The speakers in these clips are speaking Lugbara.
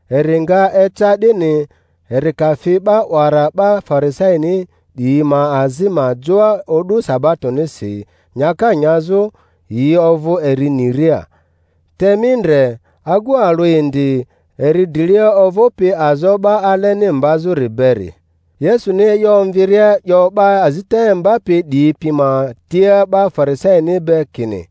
Eri nga eca 'dini, eri ka fi 'ba 'wara 'ba Farisaini 'diyi ma azi ma joa o'du sabatonisi nyaka nyazᴜ, yi ovᴜ eri niria. Te mi ndre, agu alᴜ indi eri drilia ovᴜpi azo 'ba aleni mbazᴜri beri. Yesu-ni e'yo omviria 'yo 'ba azita imbapi 'diyi pi ma tia 'ba Farisaini be kini,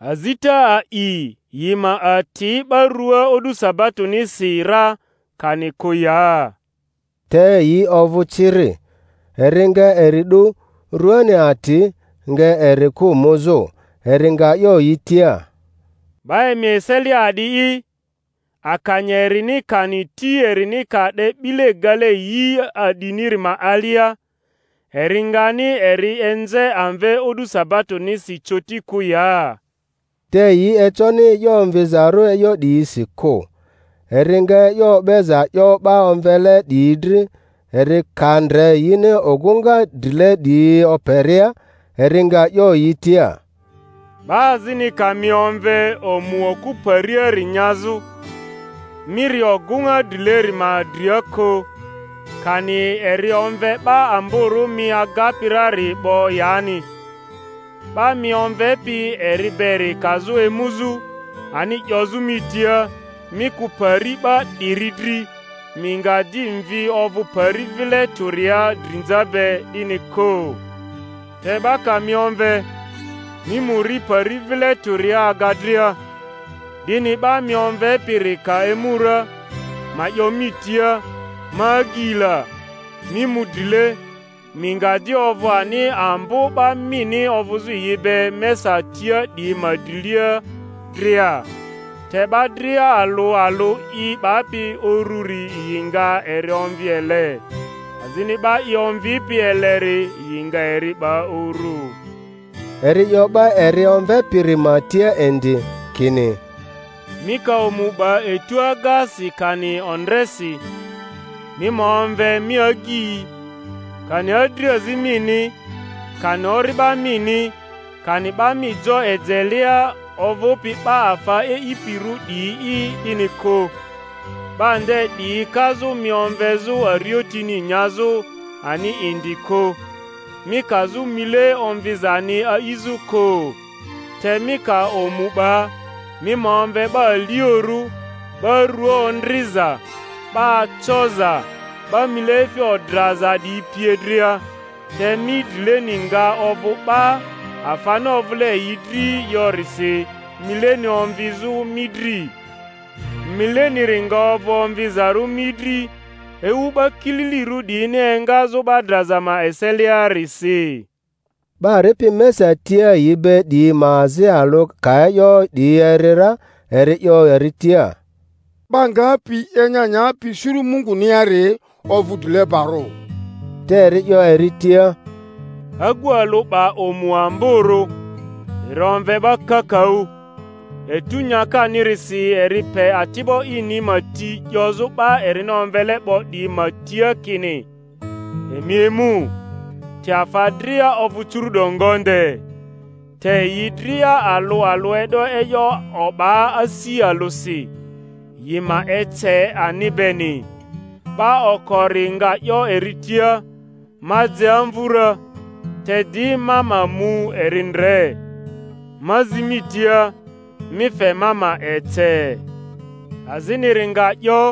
Azita a'i yi ma ati 'ba rua o'du sabatonisi ra, kani kᴜ ya? Te yi ovᴜ ciri. Eri nga eri 'du, rᴜani ati, nga eri kᴜ muzᴜ. Eri nga 'yo yi tia, 'Ba emi eselia a'di'i, akanya erini kani ti erini ka 'de 'bile gale yi a'diniri ma alia, eri ngani eri enze amve o'du sabatonisi coti kᴜ ya? Te yi econi e'yo omvizarᴜ e'yo 'diyisi kᴜ. Eri nga e'yo o'beza 'yo 'ba omvele 'diyi dri, eri ka ndre yini ogᴜŋa drile 'diyi operia; eri nga 'yo yi tia, 'Ba azini ka mi omve omu okᴜ pariari nyazᴜ, mi ri ogᴜŋa drileri ma dria kᴜ; kani eri omve 'ba amborᴜ mi agapi rari 'bo yani; 'ba mi omvepi eri beri kazᴜ emuzᴜ ani 'yozᴜ mi tia, Mi kᴜ pari 'ba 'diri dri; mi nga di mvi ovᴜ pari vile tᴜria drinza be, 'dini kᴜ. Te 'ba ka mi omve, mi mu ri pari vile tᴜria aga dria, 'dini 'ba mi omvepiri ka emu ra, ma 'yo mi tia, Ma agyi la, mi mu drile; mi nga di ovᴜ ani ambo 'ba mini ovᴜzᴜ yi be mesa tia 'diyi ma drilia dria. Te 'ba dria alᴜ alᴜ i 'bapi ururi yi nga eri omvi ele, azini 'ba i omvipi eleri yi nga eri 'ba urᴜ. Eri 'yo 'ba eri omvepiri ma tia indi kini, Mi ka omu 'ba etu agasi kani ondresi, mi ma omve mi agyi, kani adriazi mini, kani ori'ba mini, kani 'ba mi jo ejelea ovᴜpi 'ba afa e'ipirᴜ 'diyi'i 'dini kᴜ; 'ba nde 'diyi kazᴜ mi omvezᴜ ariotini nyazᴜ ani indi kᴜ, mi kazᴜ mile omvizani a'izᴜ kᴜ. Te mi ka omu 'ba, mi ma omve 'ba aliorᴜ, 'ba rua ondriza, 'ba acoza, 'ba mileefi odraza 'diyi pie dria, te mi drileni nga ovᴜ ba, afani ovᴜle yi dri yorisi mileni omvizᴜ mi dri. Mileniri nga ovᴜ omvizarᴜ mi dri ewu 'ba kililirᴜ 'diyini engazᴜ 'ba draza ma eseliarisi. 'Ba ripi mesa tia yi be 'diyi ma azi alᴜ ka e'yo 'diyi eri ra, eri 'yo eri tia, 'Ba ngapi enya nyapi suru Munguniari ovᴜ drilebarᴜ! Te eri 'yo eri tia, Agu alᴜ 'ba omu amborᴜ, eri omve 'ba kakaᴜ; etᴜ nyakanirisi eri pe ati'bo ini ma ti 'yozᴜ 'ba erini omvele 'bo 'diyi ma tia kini, Emi emu; te afa dria ovᴜ curu’do ngonde. Te yi dria alᴜ alᴜ e'do e'yo o'ba asi alᴜsi, yi ma ece ani beni. 'Ba okori nga 'yo eri tia, Ma je amvᴜ ra, te di ma ma mu eri ndre; ma zi mi tia, mi fe ma ma ece. Aziniri nga 'yo,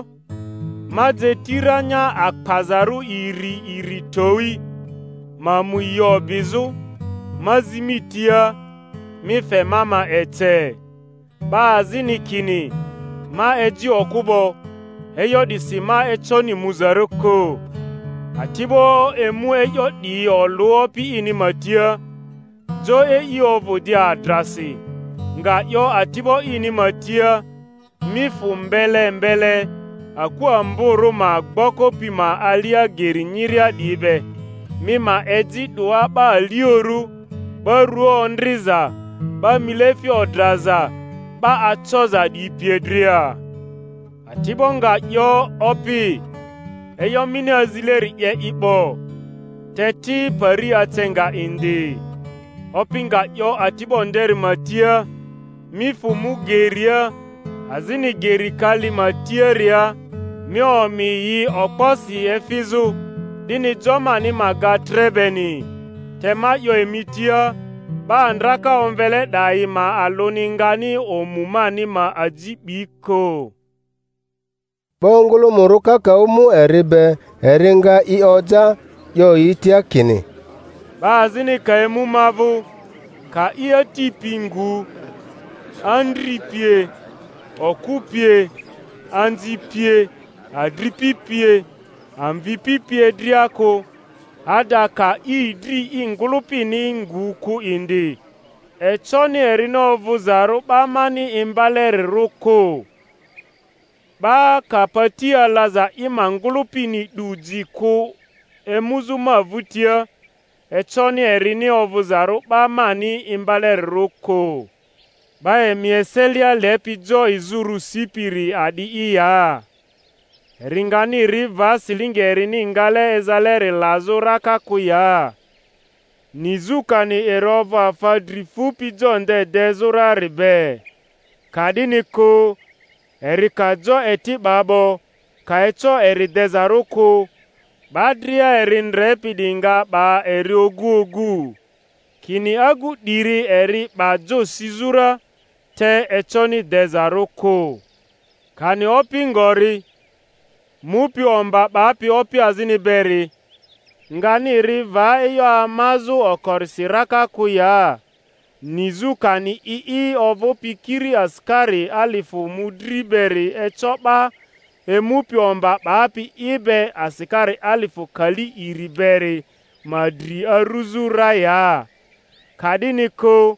Ma je ti ranya akpazarᴜ iri iri towi, ma mu yi o'bizᴜ; ma zi mi tia, mi fe ma ma ece. 'Ba azini kini, Ma eji okᴜ 'bo, e'yo 'disi ma econi muzarᴜ kᴜ. Ati'bo emu e'yo 'diyi olᴜ opi ini ma tia. Jo e'i ovᴜ di adrasi, nga 'yo ati'bo ini ma tia, Mi fᴜ mbele mbele aku amborᴜ ma gboko pi ma alia geri nyiria 'diyi be, mi ma eji 'doa 'ba aliorᴜ, 'ba rua ondriza, 'ba mileefi odraza, 'ba acoza 'diyi pie dria. Ati'bo nga 'yo, Opi, e'yo mini azileri 'ye i 'bo, te ti, pari ace nga indi. Opi nga 'yo ati'bo nderi ma tia, Mi fᴜ mu geria azini geri kali ma tiaria, mi omi yi okposi efizᴜ, 'dini jo mani ma ga tre beni. Te ma 'yo emi tia, 'ba ndraka omvele 'dayi ma alᴜni ngani omu mani ma aji 'bi kᴜ. 'Ba ongᴜlᴜmᴜrᴜ kakaᴜ mu eri be; eri nga i oja, 'yo yi tia kini, 'Ba azini ka emu ma vᴜ, ka i ati pi ngu, andri pie, okᴜ pie, anzi pie, adripi pie, amvipi pie dria kᴜ, ada ka idri i ngᴜlᴜpini ngu kᴜ indi, econi erini ovᴜzarᴜ 'ba mani imba-lerirᴜ kᴜ. 'Ba ka pati alaza i ma ngᴜlᴜpini 'du ji kᴜ emuzᴜ ma vᴜtia, econi erini ovᴜzarᴜ 'ba mani imba-lerirᴜ kᴜ. 'Ba emi eselia lepi jo izᴜrᴜ sipiri a'di'i ya, eri ngani ri va silingi erini ngale ezaleri lazᴜ raka kᴜ ya, nizᴜ kani eri ovᴜ afa dri fupi jo nde dezᴜ rari be? Ka'dini kᴜ, eri ka jo eti 'ba 'bo, ka eco eri dezarᴜ kᴜ, 'ba dria eri ndrepi 'diyi nga 'ba eri ogu ogu, kini, Agu 'diri eri 'ba jo sizᴜ ra, te econi dezarᴜ kᴜ. Kani opi ngori, mupi omba 'bapi opi azini beri, ngani ri va e'yo amazᴜ okorisi raka kᴜ ya, nizᴜ kani i'i ovᴜpi kiri asikari alifᴜ mᴜdri beri eco 'ba emupi omba 'bapi i be asikari alifᴜ kali iri beri ma dri aruzᴜ ra ya? Ka'dini kᴜ,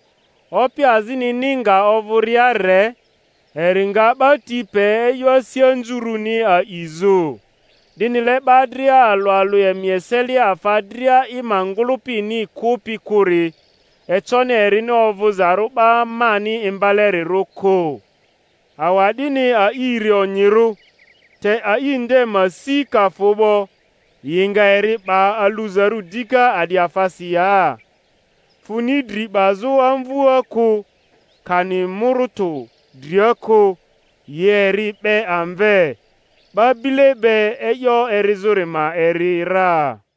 opi azinini nga ovᴜria re, eri nga 'ba ti pe e'yo asi anzurᴜni a'izᴜ. 'Dinile 'ba dria alᴜ alᴜ emi eselia afa dria i ma ngᴜlᴜpini kᴜpi kᴜri, econi erini ovᴜzarᴜ 'ba mani imbalerirᴜ kᴜ. Awa'dini a'iri onyirᴜ; te a'i nde ma si ka fᴜ 'bo, yi nga eri 'ba aluzarᴜ dika a'di afasi ya? Funi dri 'bazᴜ amvua kᴜ, kani mᴜrᴜtᴜ dria kᴜ; yi eri 'be amve. 'Ba bile be e'yo erizᴜri ma eri ra.